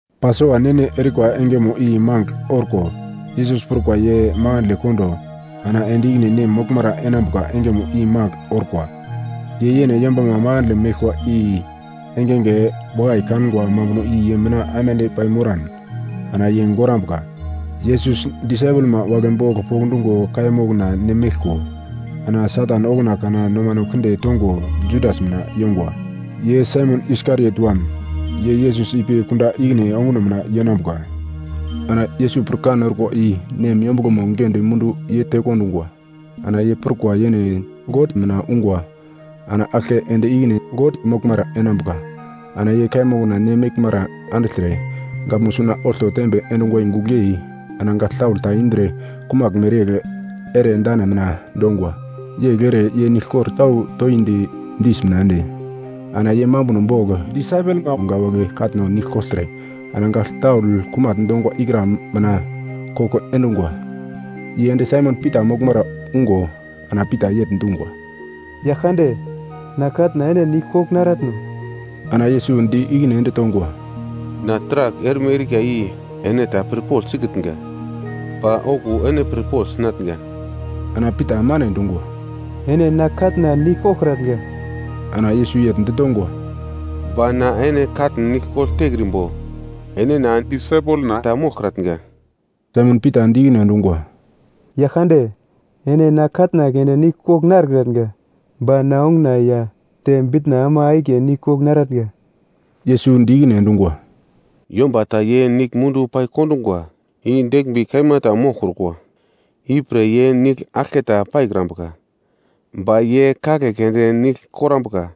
Pasova ne-ne erikwa engemo i mangigl orko. Yesus prukwa ye makandle kondo ana ende ikine Nem moglmara enambuka engemo i magl orkwa. Ye yene yombama makandle meglkwa i engenge wakai kangwa mambuno i ye mina aimande paimoran ana ye gorambuka. Yesus disaipelma wagle bogl pokndungo kaiya mokna ne meglko. Ana Satan okuna kana nomano kinde tongo Judas mina yongwa, ye Saimon Iskariot wam, ye Yesus ipi kunda ikine onguno mina yenambuka. Ana Yesus pirkan orkwa i Nem yombuglomo giglendi mundu ye tekondungwa. Ana ye prukwa yene God mina ungwa ana aglke ende ikine God moglmara enambuka. Ana ye kaiya mokna ne meglmara andigltre gaglmo suna olto tembe endungwa i gugl yei, ana gagl taul ta indre kumagl mereyegl ere dane mina dongwa. Yegl ere ye niglkor tau toindi dis mina ende, ana ye mambuno bogl disaipelma wagle katno nigl kogltre, ana gagl taul kumagl dongwa ikra mina koko endungwa. Ye ende Saimon Pita moglmara ungo ana Pita yegl dungwa, “Yaglkande na katna ene nigl kogl naratno?” Ana Yesus di ikine ende tongwa, “Na taragl erme erika i ene ta pirpogl sikitnga, ba okuwo ene pirpogl sinatnga.” Ana Pita mane dungwa, “Ene na katna nigl koglkratnga.” Ana Yesus yegl ditongwa, “Ba na ene katn nigl kogl tekrimbo ene na disaipelna ta moglkratnga.” Saimon Pita di ikine endungwa, “Yaglkande, ene na katna keunde nigl kogl narekratnga, ba na onguna ya te bitna ama akiye nigl kogl naratnga.” Yesus di ikine endungwa, “Yomba ta ye nigl mundu pai kondungwa i deglmbi kaima ta moglkrukwa, ipre ye nigl aglketa paikrambuka, ba ye kagle keunde nigl korambuka.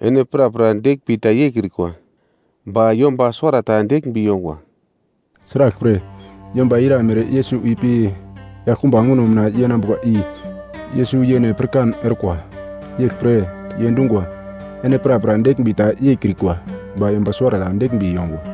Ene prapra deglmbi ta yeikrikwa ba yomba suwarata deglmbi yongwa.” Sraglpre, yomba ira mere Yesus ipi yaglkumba onguno mina yenambuka i Yesus yene pirkan orkwa. Yeglpre ye dungwa, “Ene prapra deglmbi ta yeikrikwa, ba yomba suwarata deglmbi yongwa.”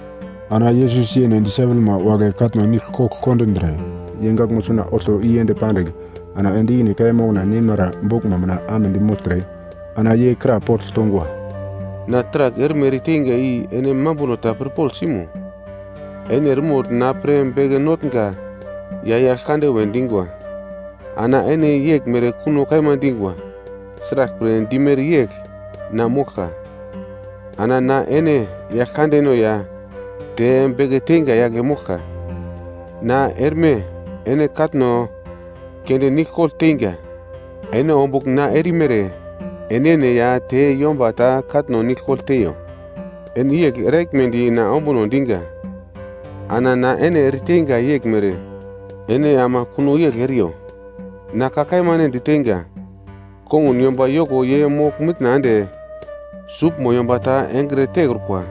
Ana Yesus yene disaipelma wagle katno nigl kogl kondindre, ye gaglmo suna olto i ende pandigl, ana ende ikine kaiya mokna neimara boglmo mina amedi mogltre, ana ye krapogl tongwa, “Na taragl erme ereteinga i ene mambuno ta pirpogl simo? Ene eremogl na pre Beke Notnga ya Yaglkande we dingwa, ana ene yeglmere kuno kaima dingwa, sraglpre dimere yegl na moglka. Ana na ene Yaglkandeno ya te Beke Teinga yagle moglka, na erme ene katno keunde nigl kogl teinga. Ene ombugl na erimere enene ya te yomba ta katno nigl kogl teiyo. Ene yegl eraglmedi na ombuno dinga. Ana na ene ereteinga yeglmere ene ama kuno yegl eriyo. Na ka kaima ene diteinga, kongun yomba yoko ye mogl-mitna ende suglmo yomba ta engre tekrukwa,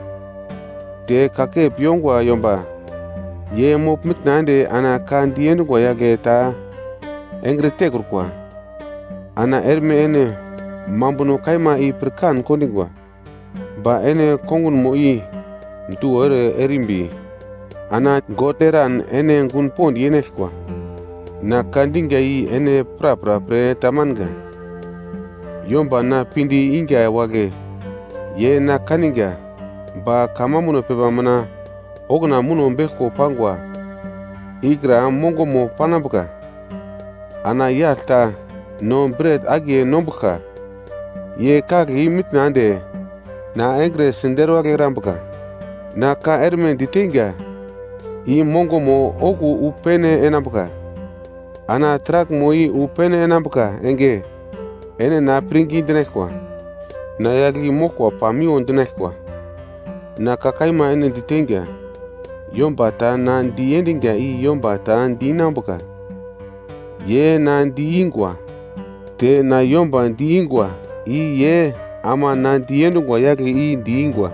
te kakep yongwa yomba ye mogl-mitna ende ana ka diendungwa yagle ta engre tekrukwa. Ana erme ene mambuno kaima i pirkan kondingwa, ba ene kongunmo i duwo ere erimbi ana God eran ene gun pond yenaglkwa. “Na ka dinga i ene prapra pre tamanga, yomba na pinde inga wagle ye na kaninga. Ba kamambuno pepa mina okuna muno beglko pangwa ikra mongomo panambuka: ‘Ana yagl ta no bret akiye nombuglka ye kagle i-mitna ende na engre siderwagl erambuka.’ “Na ka erme diteinga i mongomo okuwo wu pene enambuka, ana taraglmo i wu pene enambuka enge ene na pirngi dinaglkwa. Na yagl i moglkwa pamiwo dinaglkwa. Na ka kaima ene diteinga, yomba ta na diendinga i yomba ta di-inambuka, ye, na di-ingwa, te na yomba di-ingwa i ye ama na diendungwa yagle i di-ingwa.”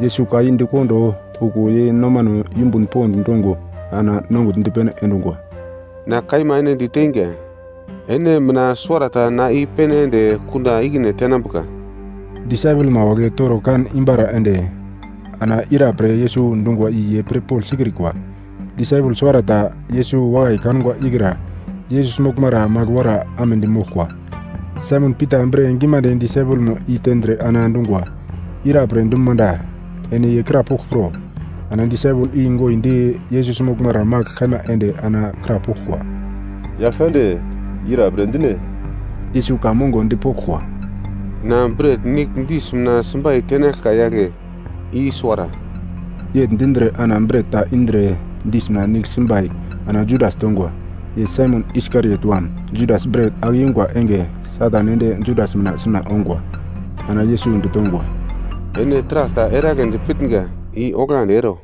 Yesus ka i di kondo, okuwo ye nomano yumbun pond dongo ana nongugl dipene endungwa, “Na kaima ene diteinga, ene mina suwarata na i-pene ende kunda ikine tenambuka.” Disaipelma wagle toro kan imbara ende, ana ira pre Yesus dungwa i ye pirpogl sikrikwa. Disaipel suwarata, Yesus wakai kangwa ikra Yesus moglmara magl wora amedi moglkwa. Saimon Pita bre gimande disaipelmo i tendre ana dungwa, “Ira pre dum manda, ene ye krapogl pro.” Ana disaipel i goindi Yesus moglmara magl kaima ende ana krapoglkwa, “Yaglkande, ira pre dine?” Yesus ka mongo dipoglkwa, “Na bret nigl dis mina simbai tenaglka yagle, i suwara.” Yegl dindre ana bret ta indre dis mina nigl simbai ana Judas tongwa, ye Saimon Iskariot wam. Judas bret ake yungwa enge, Satan ende Judas mina suna ongwa. Ana Yesus ditongwa, “Ene taragl ta eragledi pitnga i onglandi ero.”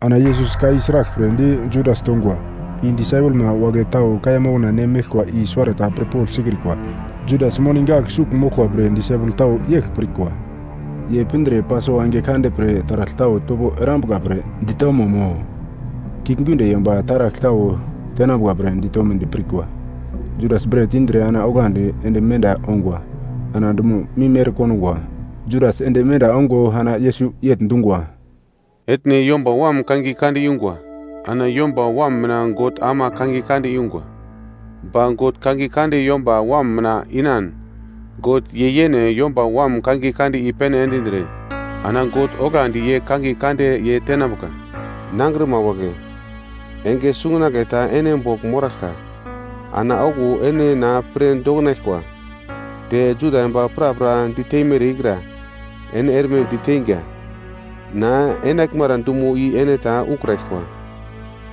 Ana Yesus ka i sraglpre di Judas tongwa, i disaipelma wagle tau kaiya mokna ne meglkwa i suwarata pirpogl sikrikwa. Judas moni gagl sugl moglkwa pre disaipel tau yegl pirkwa, ye pindre Pasova enge kande pre taragl tau topo erambuka pre ditomo mo, kiuglgiunde yomba taragl tau tenambuka pre ditomedi pirkwa. Judas bret indre ana onglandi ende menda ongwa. Ana dumo mim ere kondungwa. Judas ende menda ongo ana Yesus yegl dungwa, “Etne Yomba Wam kangiye kande yungwa. Ana Yomba Wam mina God ama kangiye kande yungwa. Ba God kangiye kande Yomba Wam mina inan, God ye yene Yomba Wam kangiye kande i-pene endindre. Ana God onglandi ye kangiye kande ye tenambuka. “Nangrima wagle, enge sungunagle ta ene bogl moraglka. Ana okuwo ene na pre doknaglkwa, te Juda yomba prapra diteimere ikra ene erme diteinga. Na enaglmara dumo i ene ta ukraglkwa.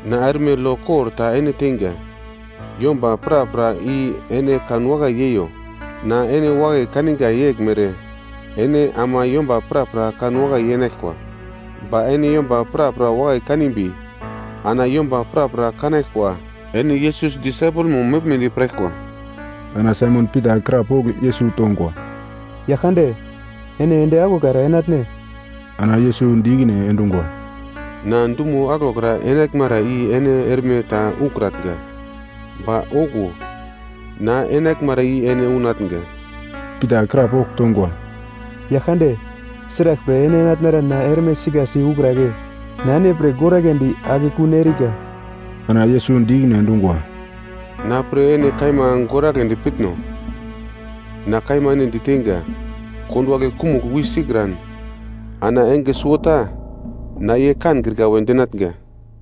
“Na erme lo kor ta ene teinga. Yomba prapra i ene kanwakai yeiyo. Na ene wakai kaninga yeglmere ene ama yomba prapra kanwakai yenaglkwa. Ba ene yomba prapra wakai kanimbi, ana yomba prapra kanaglkwa, ene Yesus disaipelmo meglmedi piraglkwa.” Ana Saimon Pita krapogl Yesus tongwa, “Yaglkande, ene ende aglokra enatne?” Ana Yesus di ikine endungwa, “Na dumo aglokra enaglmara i ene erme ta ukratnga, ba okuwo, na enaglmara i ene unatnga.” Pita krapogl tongwa, “Yaglkande, sraglpre ene enatnara na erme sikasi ukragle? Na ene pre goragledi akekun erika.” Ana Yesus di ikine endungwa, “Na pre ene kaima goragledi pitno? Na kaima ene diteinga, konduwagle kumugl wi sikran, ana enge suwota na ye kankrika we dinatnga.